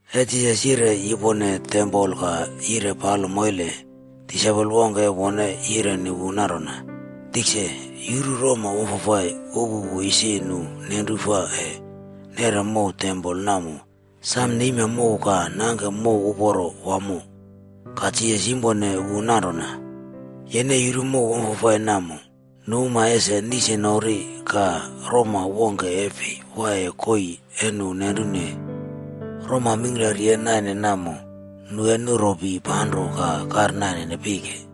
E Jisas yire yupone tempol ka yire palo moile, disaipol wongke e wone yireni wu nanrona, “Tikse, yuru roma wamfafai upupu isi nu nenru fa e nere mow tempol namo sam neima mow ka nangke mow uporo wamo.” Ka Jisas yimpone wu nanrona, “Yene yuru mow wamfafai namo. Nu uma ese nisnori ka roma wongke e fi waiye koii e nu nenrune. Roma mingklari e naine namo, nu e nuropi panro ka kairnaine pike.”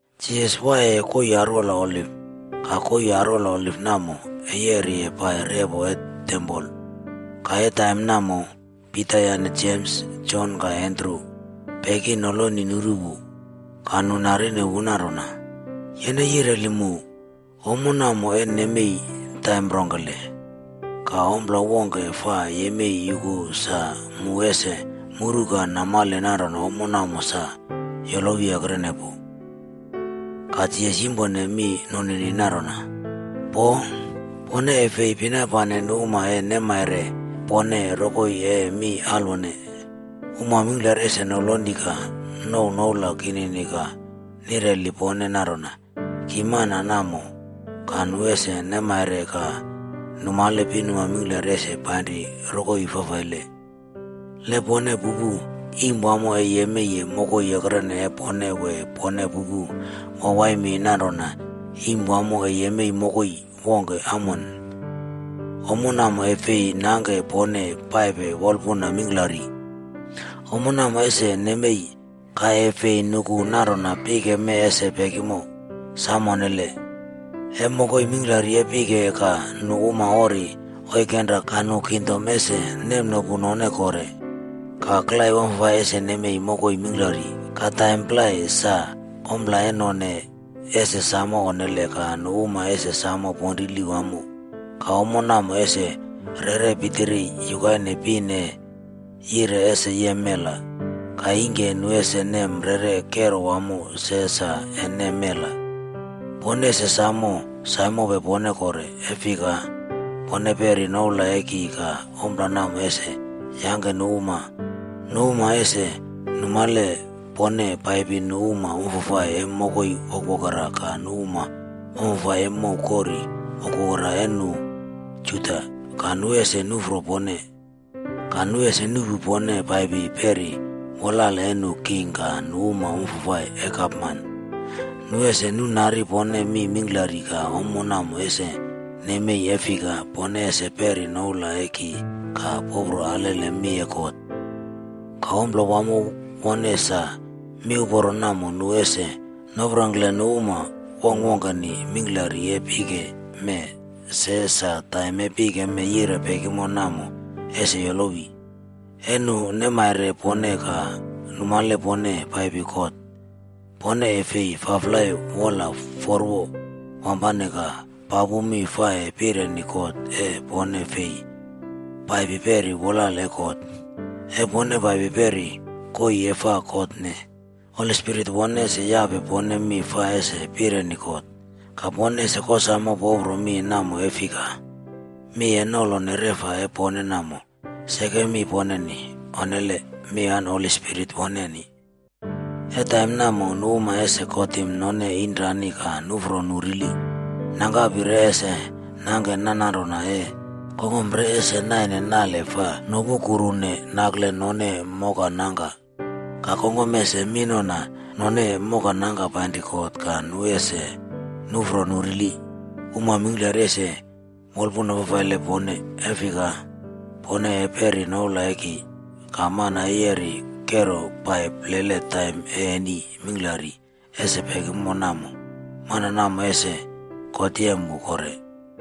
Jisas waiyeye koii arwola oliv. Ka koii arwola Oliv namo e yeri pai repo e tempol. Ka e taim namo, Pita yane Jems, Jon ka Andru peki noloni nuru wu. Ka nu narine wu nanrona, “Yene yireli mu, ommo namo e nemei taim rongkele? Ka ompla fika ese yemei yuku sa mu ese muru ka e namale nanrona ommo namo sa yolowi ekrene pu?” Ka Jisas yimpone mi nunini nanrona, “Poo! Pone e fi pinapane nu uma e nemaire pone rokoi e mi alwone. Uma mingkla ese noloni ka nouw noula kinini ka nireli pone nanrona, ‘Ki mana namo,’ ka nu ese nemmaire ka numale pinuma mingklari ese painri rokoi fafaile.” “Le pone pupu iim wamo e yemeiye mokoi ekrene e pone wee pone pupu wawai mi nanrona iim wamo e yemei mokoi wongke amone, ommo namo e fi nangke pone paipe wolapuna mingklari. Ommo namo ese nemei, ka e fi nuku nanrona pike mee ese pekimo. Sam onnele! E mokoi mingklari e pike ka nu uma ori oikenra ka nu kingdom ese nemnopu none kore. Ka klai wamfafai ese nemei mokoi mingklari. Ka taim plai, sa ompla e none ese samo onnele ka nu uma ese samo ponrili wamo. Ka ommo namo ese rere pitiri yukaine pin e yire ese yem mela. Ka ingki nu ese nem rere kero wamo se sa e nem mela.” “Pone ese sam saimope pone kore. E fika, pone peri noula e ki ka ompla namo ese yangke nu uma ese numale pone paipi nu uma wamfafai e mokoi wokwokera ka nu uma wamfafai e mow kori wokwokera e nu Juda, ka nu ese nufro pone. Ka nu ese nuꞌpu pone paipi peri wolale e nu king ka nu uma wamfafai e gapman. Nu ese nunari pone mi mingklari ka ommo namo ese nemei e fika pone ese peri noula e ki ka popro alele mi e God. Ka ompla wamo wone sa, miuporo namo nu ese noprongkle nu uma wongkwongkeni mingklari e pike mee se sa taim e pike mee yire pekimo namo, ese yolowi. E nu neimare pone ka numale pone paipi kot, pone e fi faflai wola forwo wampane ka papu mi fa e pireni kot e pone fi paipi peri wolale e kot. E pone paipi peri koii e fa kotne, Holi Spirit wone ese yape pone mi fa ese pireni kot. Ka pone ese kosamo popro mi namo e fika, mi e nolone reꞌfa e pone namo, seke mi poneni. Onnele! Mi an Holi Spirit woneni.” “E taim namo, nu uma ese kotim none inrani ka nufro nu rili. Nangkapi re ese nangke nanronanro e kongkom e none. Kongkom re ese naine nale fa nopukukrune nakle none mokanangka. Ka kongkom ese minona none mokanangka painri kot ka nu uma ese nufro nu rili. Uma mingklari ese wolpun fafaile pone, e fika pone e peripe noula e ki. Ka mana e yeri kero pai plele taim e eni mingklari ese pekimo namo, mana namo ese God yem wu kore.”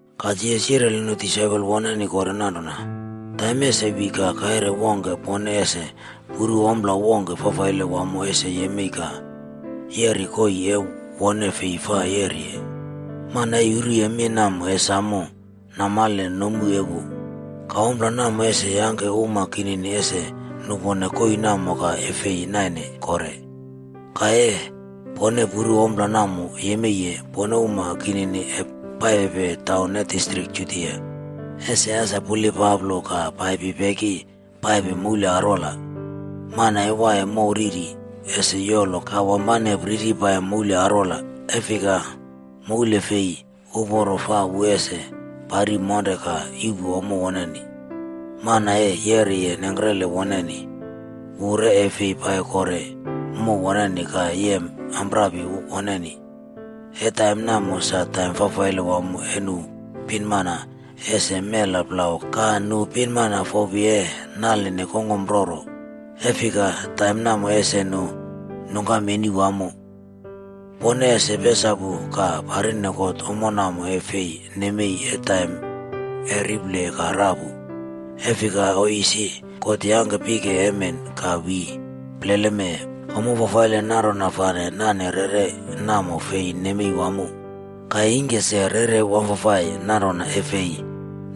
Ka Jisas yireli nu disaipol woneni kore nanrona, “Taim ese wi ka e kaire wongke pone ese puru ompla wongke fafaile wamo ese yemei ka yeriye koii e wone fi fa yeriye.” Mana e yuruye mi namo e samo namale nomu e wu. “Ka ompla namo ese yangke uma kinini ese nupone koii namo ka e fi nainea kore. Ka e pone puru ompla namo yemeiye, pone uma kinini e paipepe taun e distrik Judia ese as pulilpaplo ka paipi peki paipe moule arwola. Mana e waiye mow riri, ese yolo ka wampane priri pai moul arwola. E fika mouli fi uporo fa wu ese pari monre ka yuꞌpu ommo woneni. Mana e yeriye nengkrele woneni, wu re e fi pai kore mow woneni ka yem amprapi woneni. E taim namo sa taim fafaile wamo e nu pinmana ese mela plau ka nu pinmana fopi e naline kongkom roro. E fika, taim namo ese nu nungkam eni wamo. Pone ese pesapu ka parine God ommo namo e fi nemei e taim e riple ka rapu. E fika oiy isi, God yangke pike emen ka wi plele mee, ommo fafaile nanrona fa nane rere namo fi nemei wamo. Ka ingke se rere wamfafai nanrona e fi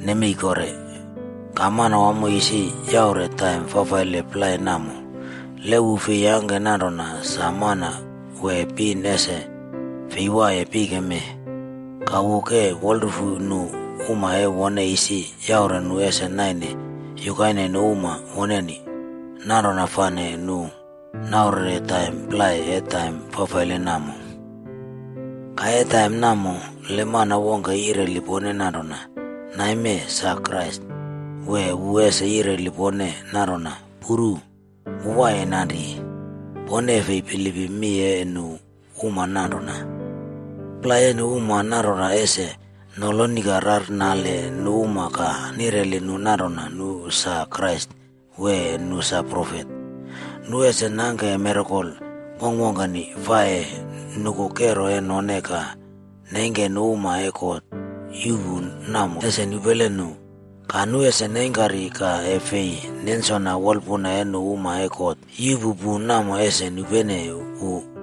nemei kore. Ka Manwamo isi yaure taim fafaile plai namo. Le wu fi yangke nanrona, sa mana wee pin ese fi waiye pike mee. Ka wu ke wolarufu nu uma e wone isi yaure nu ese naine yukaine nu uma woneni, nanrona fane wu yaurere taim plai e taim fafaile namo.b” “Ka e taim namo, le mana wongke yireli pone nanrona, ‘Naime sa Krais’ wee wu ese yireli pone nanrona, ‘Puru! Wu waiye nanri.’ Pone e fi bilipim mi e nu uma nanrona. Plai e nu uma nanrona ese noloni ka rarnale nu uma ka nireli nu nanrona nu sa Krais wee nu sa profet. Nu ese nangke mirakol wongkwongkeni fa e nuku kero e none ka neingke nu uma e God yuꞌpu namo ese nupele nu. Ka nu ese neingkari ka e fi nensona wolapuna e nu uma e God yuꞌpu pu namo ese nupene wu.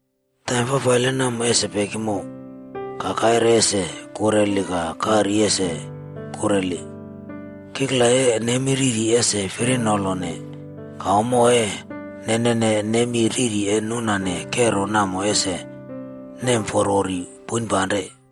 “Taim fafaile namo ese pekimo, ‘ka kaire ese kureli ka kari ese kureli. Kikla e nemi riri ese firinolone, ka ommo e nenene nemi riri e nunane kero namo ese nemforwori poinpanrene.’c”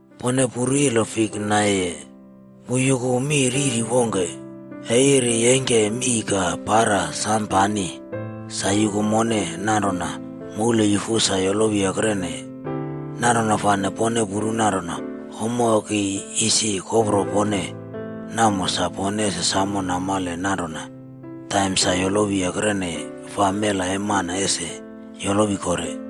“Pone puru ilo fik naiye. Wu yuku mi riri wongke. E iri neingke mii ka para sam pani, sa yuku mone nanrona moule yufu sa yolowi ekreneye. Nanrona fane pone puru nanrona ommo e ki isi kopro pone namo sa pone ese samo namale nanrona taim sa yolowi ekreneye fa Mela E Mana ese yolowi kore.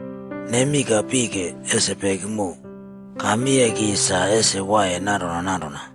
Nemi ka pike ese pekimo. Ka mi e ki sa ese waiye nanrona nanrona.”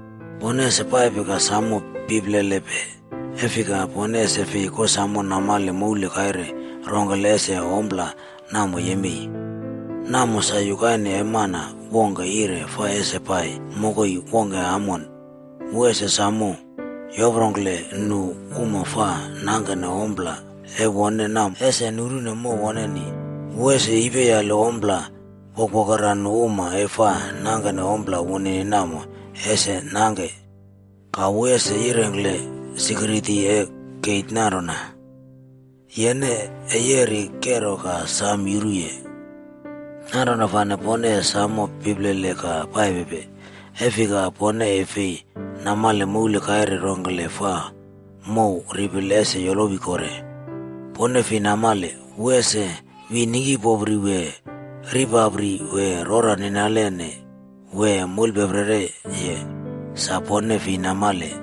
“Pone ese paipe ka sam pilpelepe, e fika pone ese fi kosamo namale mouli kaire rongkele ese ompla namo yemei. Namo sa yukaine e mana wongke yire fa ese pai mokoi wongke amon, wu ese sam yoprongkle nu uma fa nangkene ompla e wone namo ese nunrene mow woneni. Wu ese yepiyale ompla wokwokera nu uma e fa nangke ompla wunini namo ese nangke. Ka wu ese yireni sikiriti e keit nanrona, ‘Yene ee yeri kero ka sam yuruye.’” “Nanrona fane pone e sam pilpele ka paipe. E fika pone e fi namale moul kaire rongkele fa mow ripile ese yolowi kore. Pone fi namale, wu ese wi ningkipopri wee ripapri wee rora ninalene wee moulepeprereye, sa pone fi namale.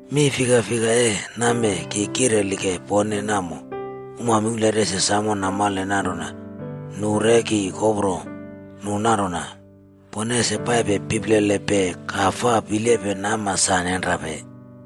Mi fikfika e namee ki kirelike pone namo, uma mingklari ese samo namale nanrona nu re ki kopro nu nanrona, ‘Pone ese paipe pilpelepe ka faa pilepe nama sa nenrape.’”